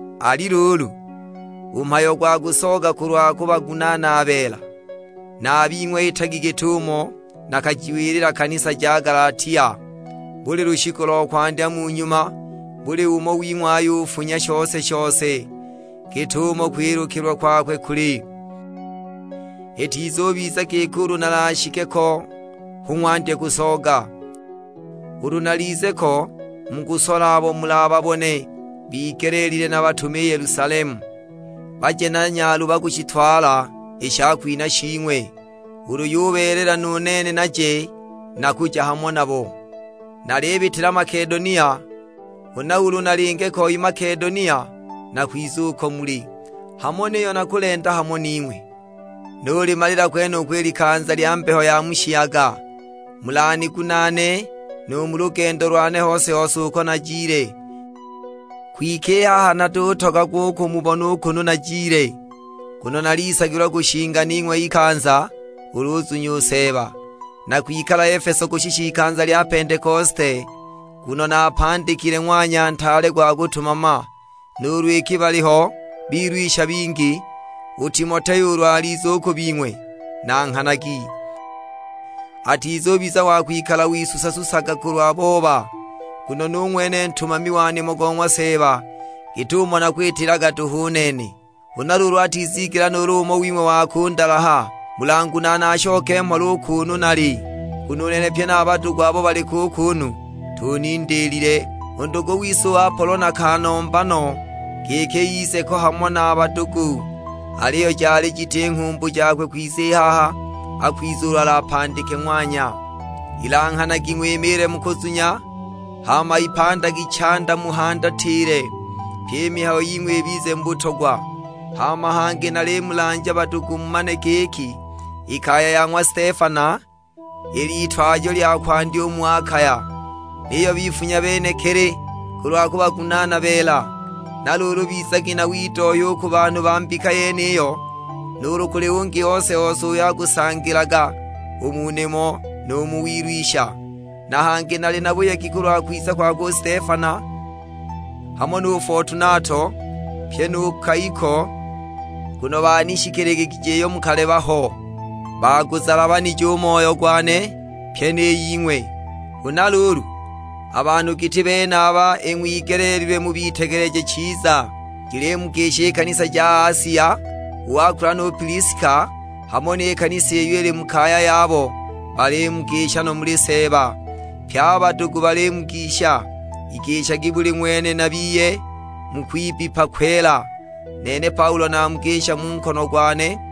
Ali luulu, u mhayo gwa kusooga kulwa kubagunaana beela, na a bing'we itagi git'umo nakajiwilila kanisa ja Galatia. Buli lushiku lo kwandya mu nyuma buli umo wing'we ayufunya shose-shose git'umo kwilukilwa kwakwe kuli, itizubiza giki ulu nalashike ko hu ng'wandye kusooga. Ulu nalize ko mukusola abo mulababone bigeleelilwe nabatume i Yelusalemu, baje na nyaluba kushitwala i shakwinha shing'we. Ulu yubeelela nu nene naje, nakuja hamo nabo. Nalibitila Makedonia, huna ulu nalinge ko i Makedonia nakwiza uko muli. Hamo niyo nakulenda hamo ning'we, nulimalila kwenuko i likanza lya mbeho ya mu shiyaga, mulanigunaane nu mu lugendo lwane hose-hose uko najile. Kwike i haha natutogagwa u kumubona u kunu najile, nguno nalisagilwa kushinga ning'we ikanza ulu uzunya u Seeba. Nakwikala Efeso kushisha ikanza lya Pentekosite; nguno napandikile ng'wanya ntaale gwa kutumama, nuulu iki baliho bilwisha bingi. U Timoteo ulu alize u ku bing'we nanghanagi, atizubiza wa kwikala wisusa-susaga kulwa booba; nguno nu ng'wene ntumami wa nimo go ng'wa Seeba, git'umo nakwitilaga duhu u nene. Huna luulu atizigela nuulu umo wing'we wa kundalaha. Mulangunaane ashoke mhola u kuunu nali, nguno u nene pye na a badugu abo baliko u kuunu tunindiilile. U ndugu wise u Apolo nakanomba no, giki ize ko hamo na a badugu; aliyo jali jiti nghumbu jakwe kwiza i haha, akwiza ulu alapandike ng'wanya. Ilanghanagi ng'wimiile mu kuzunya, hama ipandagi chanda muhandatile; pyi i mihayo ying'we ibize mu butogwa. Hama hangi nalimulanja badugu mumane giki, i kaya ya ng'wa Stefana il'itwajo lya kwandya u mu Akaya; niyo bifunya benekili kulwa kubagunaana beela. Na luulu bizagi na widohya u ku banhu ba mbika yeniyo, nuulu kuli ungi ose-ose uyo akusangilaga u mu nimo nu mu wilwisha. Na hangi nali na buyegi kulwa kwiza kwakwe u Stefana, hamo nu Fotunato; pyi nu Kaiko, nguno banishikiligigije iyo mukaleba ho. Baaguzalanije u moyo gwane, pyi ni ying'we. Huna luulu, a banhu giti benaba ing'wigeleelilwe mubitegeleje chiza. Jilimugisha i kanisa ja Asia; u Akula nu Piliska, hamo ni kanisa iyo ili mu kaya yabo balimugisha no muli Seeba. Pye a badugu balimugisha. Igishagi buli ng'wene na biye mu kwibbipa kwela. Nene Paulo namugisha mu nkono gwane.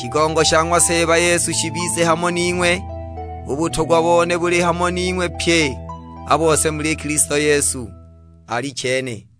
Shigongo sha ng'wa Seeba Yesu shibize hamo ning'we. U butogwa bone buli hamo ning'we pye a bose muli Kilisto Yesu: Alichene.